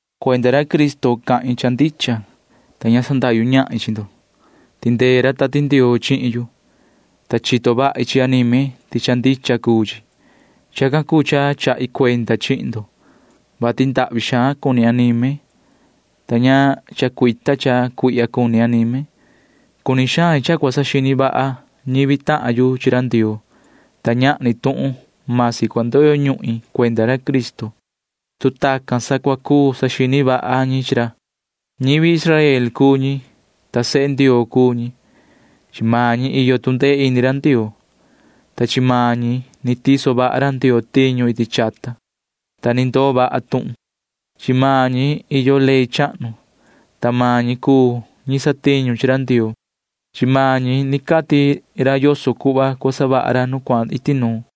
Cuenda ra Cristo cahin cha ndicha, ta ña sandahyu ñahin chi ndo. Tindee ra Tati Ndioo chihin yu, ta chito vahi chi anime ti cha ndicha cuu chi. Chacan cuu cha chahi cuenda chihin ndo, vati ndahvi xaan cuni anime, ta ña ni chacuita cha cuihya cuni anime. Cuni xain cha cua saxini vaha ñivi tahan yu chi ra Ndioo, ta ñahni tuhun―masi cua ndoyo ñuhin cuenda ra Cristo, tu tacan sa cua cuu saxini vaha ñi chi ra. Ñivi Israel cuu ñi, ta sehe Ndioo cuu ñi. Chi maan ñi iyo tu ndee ini ra Ndioo, ta chi maan ñi ni tiso vaha ra Ndioo tiñu iti chata, ta ni ndoo vaha tuhun. Chi maan ñi iyo ley chahnu, ta maan ñi cuu ñi satiñu chi ra Ndioo. Chi maan ñi ni cati ra yoso cuhva cua savaha ra nu cuahan iti nuun.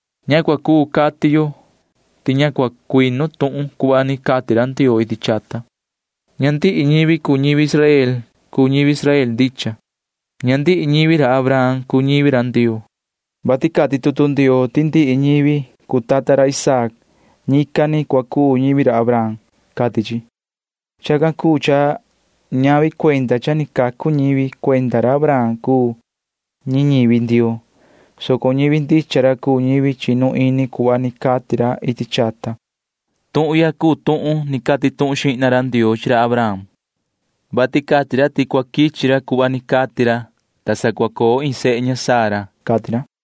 Ña cua cuu cati yo ti ña cua quee tuhun cuhva ni cati ra Ndioo iti chata. Ña ndihi ñivi cuu ñivi Israel cuu ñivi Israel ndicha. Ña ndihi ñivi ra Abraham cuu ñivi ra Ndioo, vati cati tutu Ndioo ti ndihi ñivi cua coo cuenda iin tuhun ni ra Isaac―ñican ni cua cuu ñivi Abraham, cati chi. Chacan cuu cha ñavi cuenda cha ni cacu ñivi cuenda ra Abraham cuu ñi ñivi Ndioo, soco ñivi ndicha ra cuu ñivi chinu ini cuhva ni cati ra iti chata. Tuhun ya cuu tuhun ni cati tuhun xihna ra Ndioo chi ra Abraham, vati cati ra ti cua quichi ra cuhva ni cati ra, ta sa cua coo iin sehe ña Sara, cati ra.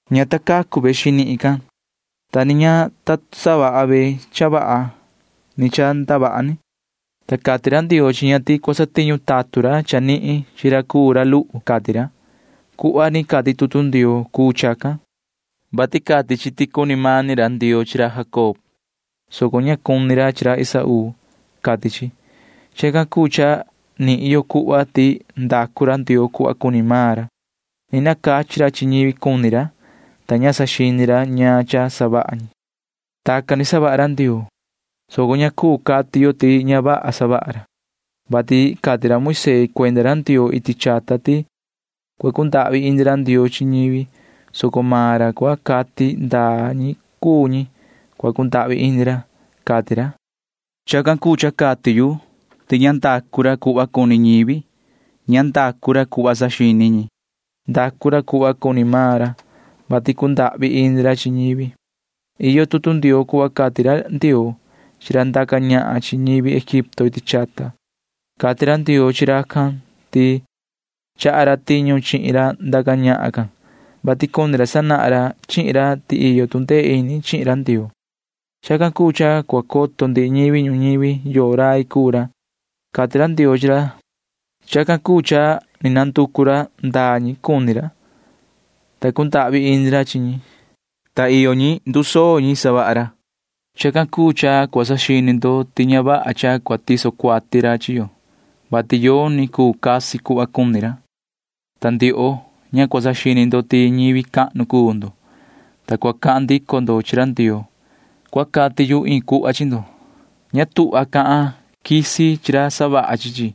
Ña ta cacu ve xinihin can, ta ni ña ta savaha ve cha vaha ni cha ndavaha ni, ta cati ra Ndioo chi ña ti cua satiñu tatun ra chanihin chi ra cuu ra luhu, cati ra. Cuhva ni cati tutu Ndioo cuu chacan, vati cati chi ti cuni mani ra Ndioo chi ra Jacob, soco ña cuni ra chi ra Esaú, cati chi. Chacan cuu cha nihin yo cuhva ti ndacu ra Ndioo cuhva ni cuni maan ra. Ni nacachi ra chi ñivi cuni ra, ta ña saxini ra ñaan cha savaha ñi. Tacan ni savaha ra Ndioo, soco ña cuu cati yo ti ña vaha savaha ra, vati cati ra Moisee cuenda ra Ndioo iti chata ti cua cundahvi ini ra Ndioo chi ñivi, soco maan ra cua cati ndaa ñi cuu ñi cua cundahvi ini ra, cati ra. Chacan cuu cha cati yu ti ña ndacu ra cuhva cuni ñivi. Ña ndacu ra cuhva sanini ñi. Ndacu ra cuhva cuni maan ra, vati cundahvi ini ra chi ñivi. Iyo tutu Ndioo cuhva cati ra Ndioo chi ra ndaca ñahan chi ñivi Egipto iti chata. Cati ra Ndioo chi racan ti chaha ra tiñu chihin ra ndaca ñahan can, vati cuni ra sanahan ra chihin ra ti iyo tu ndee ini chihin ra Ndioo. Chacan cuu cha cua coto ndihi ñivi ñuñivi yoo rai cuu ra, cati ra Ndioo chi ra. Chacan cuu cha ni nanducu ra ndaa ñi cuni ra, ta cundahvi ini ra chi ñi, ta ndaa ñi cuni ra―ndusoo ñi savaha ra. Chacan cuu cha cua saxini ndo ti ña vaha cha cua tiso ra cuati chi yo, vati yoni cuu casi cuhva cuni ra. Hombre, ña cua saxini ndo ti ñivi cahnu cuu ndo, ta cua cahan ndico ndo chi ra Ndioo. [Cua cati yu iin cuhva chi ndo.] Ña tuhva cahan quisi chi ra savaha chi chi.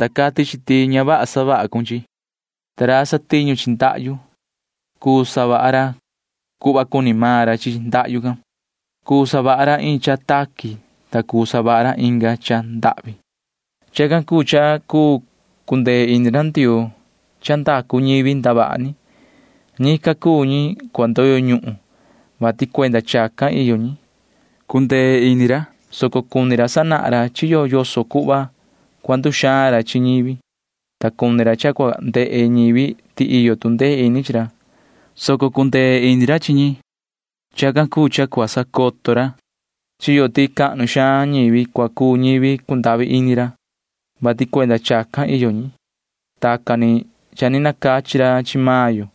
Ña cati chi ti ña vaha cuhva cha ni savaha ra chihin chi. Ta ra satiñu chi ndahyu―cuu savaha ra cuhva cuni maan ra chi ndahyu can. Cuu savaha ra iin cha taqui, ta cuu savaha ra inga cha ndahvi. Chacan cuu cha cuu cundee ini ra Ndioo cha ndacu ñivi ndavaha ni. Ñican cuu ñi cua ndoyo ñuhun, vati cuenda chacan iyo ñi. Cundee ini ra, soco cuni ra sanahan ra chi yo yoso cuhva cua nduxaan ra chi ñivi, ta cuni ra cha cua ndehe ñivi ti iyo tu ndee ini chi ra, soco cundee ini ra chi ñi. Chacan cuu cha cua sacoto ra chi yo ti cahnu xaan ñivi cua cuu ñivi cundahvi ini ra, vati cuenda chacan iyo ñi. Tacan ni cha ni nacachi ra chi maan yo.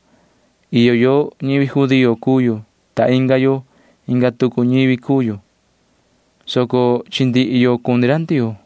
Iyo yo―ñivi judío cuu yo, ta iyo tahan yo―ñivi cuu inga tucu ñivi cuu yo, soco chi ndihi yo cuni ra Ndioo.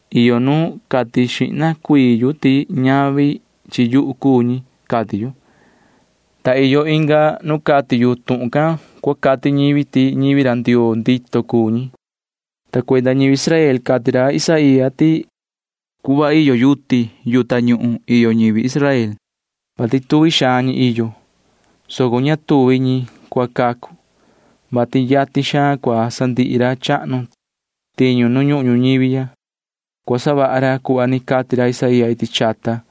Iyo nu ni cati xihna yu ti ñavi chi yuhu cuu ñi, cati yu, ta suvi ni ican nu cati yu tuhun can cua cati ñivi ti ñivi ra Ndioo ndito cuu ñi, cati ra. Ta cuenda ñivi Israel cati ra Isaía ti cuhva iyo yuti yu tañuhun iyo ñivi Israel, [vati tuvi xaan ñi iyo,] soco ña tuvi ñi cua cacu, vati yatin xaan cua sandihi ra chahnu tiñu nu ñuhun ñuñivi ya. Cua savaha ra cuhva ni cati ra Isaía iti chata,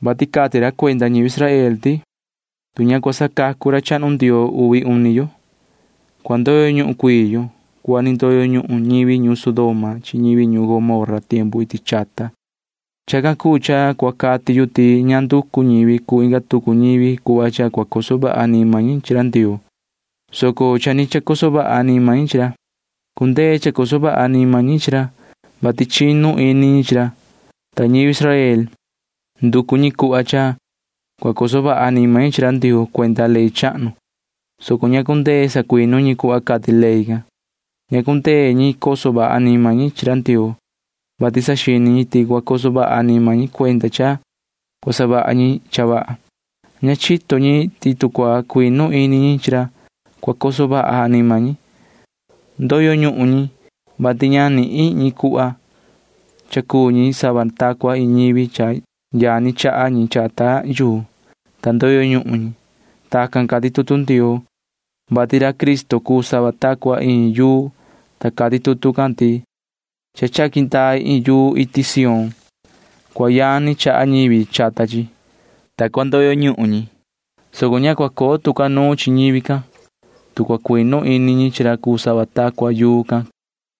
vati cati ra cuenda ñivi Israel ti: Tu ña cua sacacu ra chahnu Ndioo uvi uni yo, cua ndoyo ñuhun cuii yo cuhva ni ndoyo ñuhun ñivi ñuun Sodoma chi ñivi ñuun Gomorra iti chata, cati ra. Chacan cuu cha cua cati yu ti ña nducu ñivi cuu inga tucu ñivi cuhva cha cua coso vaha anima ñi chi ra Ndioo, soco cha ni chacoso vaha anima ñi chi ra. Cundee chacoso vaha anima ñi chi ra, vati chinu ini ñi chi ra. Ta ñivi Israel―nducu ñi cuhva cha cua coso vaha anima ñi chi ra Ndioo cuenda ley chahnu, soco ña cundee sacuinu ñi cuhva cati ley can. Ña cundee ñi coso vaha anima ñi chi ra Ndioo, vati saxini ñi ti cua coso vaha anima ñi cuenda cha cua savaha ñi cha vaha. Ña chito ñi ti tu cua cuinu ini ñi chi ra, cua cundee coso vaha anima ñi. Ndoyo ñuhun ñi, vati ña nihin ñi cuhva. Cha cuu ñi sava ta cua iin ñivi, ta yani chaha ñi chata yuu, ta ndoyo ñuhun ñi. Tacan cati tutu Ndioo, vati ra Cristo cuu sava ta cua iin yuu, ta cati tutu can ti: Cha chaqui ndai iin yuu iti Sión. Cua yani chaha ñivi chata chi, ta cua ndoyo ñuhun ñi, soco ña cua coo tu ca nuun chi ñivi can, tu cua cuinu ini ñi chi ra cuu sava ta cua yuu can, cati chi.